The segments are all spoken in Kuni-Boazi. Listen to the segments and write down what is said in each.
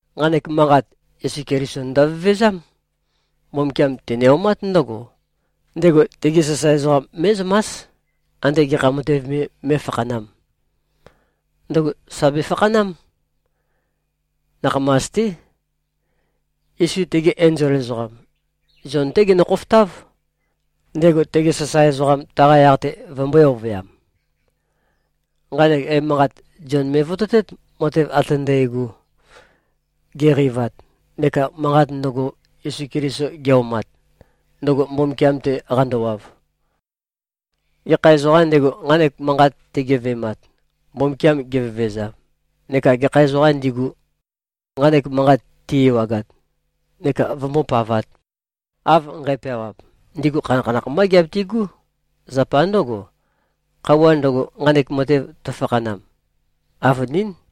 Nqanek manqat, Yesu Keliso ndøvevezám. Mbumbukiam tene-omát ndǿgo: Ndego tegi sasae ezoqam mé꞉zømás, ande gekha matev me mé꞉fakhanām. Ndøgo sà befakhanám. Nakhamas-té. Yesu tege enzol ezoqam, Zion-té gendo-khofotáv, ndego tege sasae ezoqam, taqa yaq-te vømbø̄e-ovøyam. Nqanek emanqat, Zion me꞉vototét, matev ate ndægo, geqeivat, neka manqat ndøgo, Yesu Keliso ge꞉-omat, ndøgo Mbumbukiam-te qandowav. Gekha ezoqām ndego, nqanek manqat tegeve꞉mat, Mbumbukiam gevevezam, neka gekha ezoqām ndigu, nqanek manqat ti-ewagat, neka vømbópavāt, av nqæpeawap, ndigu khanakhanakh mbá giabitigú. Zapa ndǿgo, khøuwa ndøgo, nqanek matev tøfakhanam, avønín.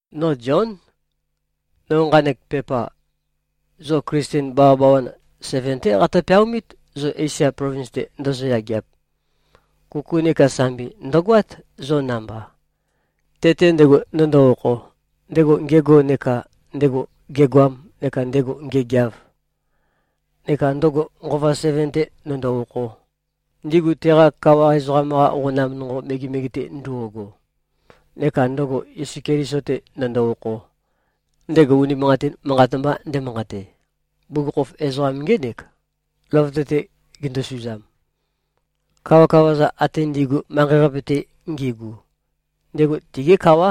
No Zión. No nqanek pepa, zo Klisten bawabawan seven-té qatø-peaomít, zo Esia plovins-te ndozo-yageap. Kuku neka sambi ndø̀goát, zo namba, te-te ndego ndøndo-okho, ndego ngego neka ndego gegoam neka ndego ngegeav, neka ndøgo nqova seven-te ndøndo-okho, ndigu teqa kawa ezoqam-qa qonam nonqo megemege-te ndo꞉go, neka ndøgo Yesu Keliso-te ndøndo-okho, ndego unimanqatin manqat mba ndemanqate. Bugukhokhof ezoqam ngének, løvøte-te gendosuzam. Kawakawa-za ate ndi꞉gu, manqei-qape-te ngigu, ndego tigí kawá.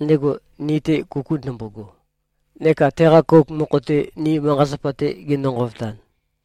Ndego, ni-te kuku ndømbogo neka teqa kouk mokho-te, ni manqa-zapa-te gendo-nqovotan,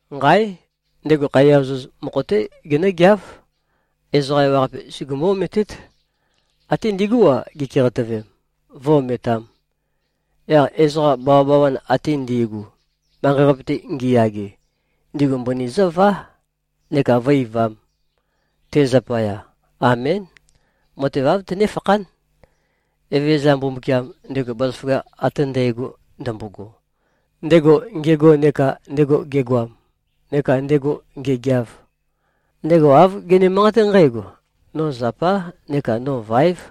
Nqáe! Ndego khaiya ozoz mokho-té genǿgeáv. Ezoqa ewaqape sugumú-ometét. Ate ndigú-a, gikeqatøvem, vǿ-ometām. Yaq ezoqa bawabawan ate ndi꞉gu, manqei-qape-te ngiyage, ndigu mbøni zǿvá neka vǿ-eivām, te zapaya. Amén. Matev āv tønéfakhán. Evezøza Mbumbukiam, ndego bazaføgakh ate ndægo ndømbogo, ndego ngego neka ndego gegoam neka ndego ngegeav, ndego āv gene-manqaté nqǽgo, “No zapá neka no váev.”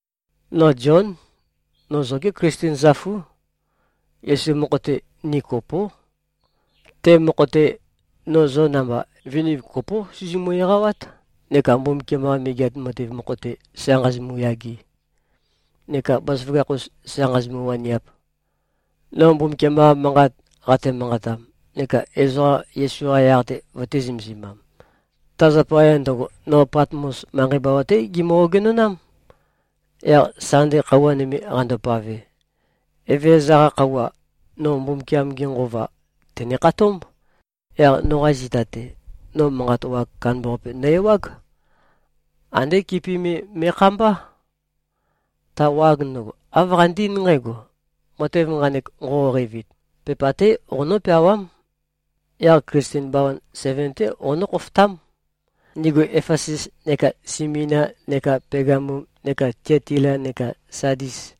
No Zión. No zogé Klisten zøfú. Yesu mokho-te, ni kopó. Te mokho-te, no zo namba, viniv kopó sizimu-eqawát neka Mbumbukiam-qa Megeat Matev mokho-te sa nqāzīmū-yāgē, neka bazaføgakh-us sa nqāzīmū-wānīāp. No Mbumbukiam-qa manqat qate-manqatam neka ezoqa Yesu-qa yaq-te vøtē-zømesimam, ta zapaya ndøgo, no Patmos manqei bawa-té gimø-ogenonám. Yaq Sande khøuwa nøme qandopave, Evezøza-qa khøuwa, no Mbumbukiam-ge Nqova tène-khatómb. Yaq noqa zita-te, no manqa wag kandambaqape nø-ewág. Andé kipi me me꞉khambá. Ta wag ndøgo, āv qande-eín nqǽgo, “Matev nqanek nqoqo-qeivit, pepa-té qonó-peawám. Yaq Klisten bawan seven-té qonǿ-khofotám, ndigu Efesus neka Simina neka Pegamum neka Tiatila neka Sadis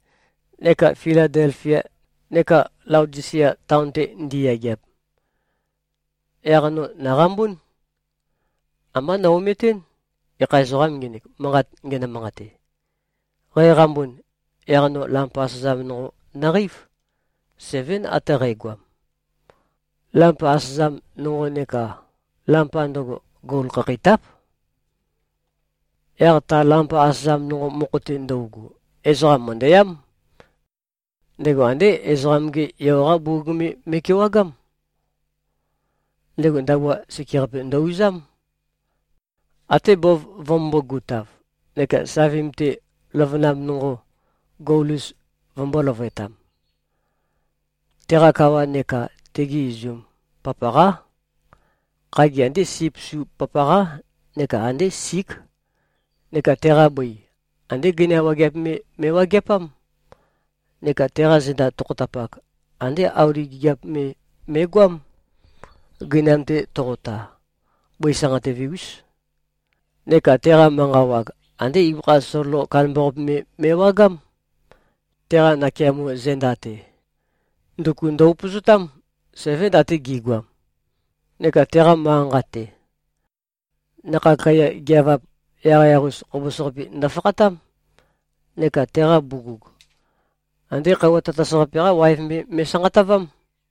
neka Filadelfia neka Laodisia taon-te ndiyageap.” Yaq no nòqambún. Ambá no-ometɨ́n, gekha ezoqām ngenek, manqat ngenø-manqate. Qæqambun, yaq no lampa asøzam nonqo nøqeív. Sevén ate qægoam. Lampa asøzam nonqo neka lampa ndøgo, gol khakheitáp. Yaq ta lampa asøzam nonqo mokho-te ndøugu, ezoqam mø̀ndøyám. Ndego andé Ezoqam-ge Yo-qá bugug me me꞉kewagám. Ndego ndabua sekeqape ndø-uzám, até bov vømømbō-gutav, neka savim-te løvønam nonqo gol-us vømbø̄e-løvøtam. Teqa kawa neka tegi izum, papaqá. Khagi, andé sip su papaqá neka andé sík. Neka teqa bøi, andé gøina wageap me me꞉wageapám. Neka teqa zenda tokhotapak, andé auli gigiap me me꞉goám, gøinam-te toqota. Bøi sanqatøve-ús. Neka teqa manqa wag, andé ibøkha sololo kandambaqape me me꞉wagám. Teqa nakeamo zenda-te, nduku ndø-upøzotám. Sevén, ate gi꞉goam. Neka teqa manqa-nqa-te, nakhag kaiya geøvap yaqyaq-us khobos-qapi ndofakhatám. Neka teqa bugug, andé khøuwa tatas-qape-qá waev me me꞉sanqatavám.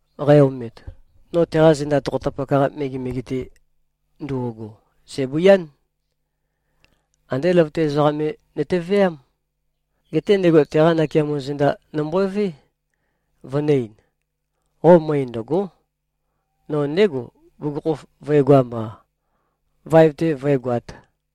Qæ-omet, no teqa zenda tokhotapak-qa megemege-te ndo꞉go, sæ̀bøián. Andé løvøte ezoqam me nøteveám. Geté ndego teqa nakeamo zenda nømbové, vønø̄-ein, “Qo møe ndø̀go᷄! No ndégo, bugukhokhof vø̄egoam-a, vaev-te vǿegoāt.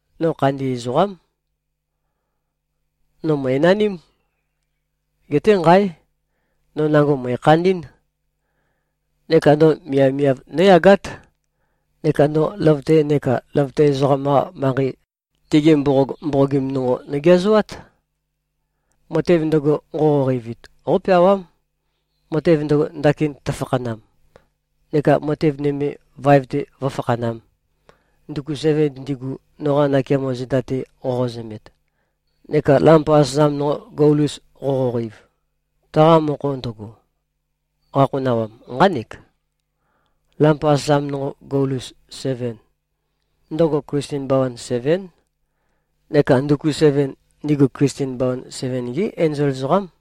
No khandi ezoqám. No mø̀enaním. Geté nqáe! No nango mø̀ekhandí꞉n. Neka no miavmiav nǿyagát. Neka no løvøte neka løvøte ezoqam-qa manqei, tigi mboqog mboqogim nonqo nogeazoát. Matev ndøgo, nqoqo-qeivit, qópeawám, matev ndøgo, ndakin tøfakhanam, neka matev nøme, vaev-te vǿfakhanām. Nduku seven ndigu, noqa nakeamo zenda-te qoqozømet, neka lampa asøzam nonqo gol-us qoqoqeiv, taqa mokho ndøgo, qakhonawam, nqánek: Lampa asøzam nonqo gol-us seven, ndøgo Klisten bawan sevén. Neka nduku seven, ndigu Klisten bawan seven-gí enzol ezoqám.”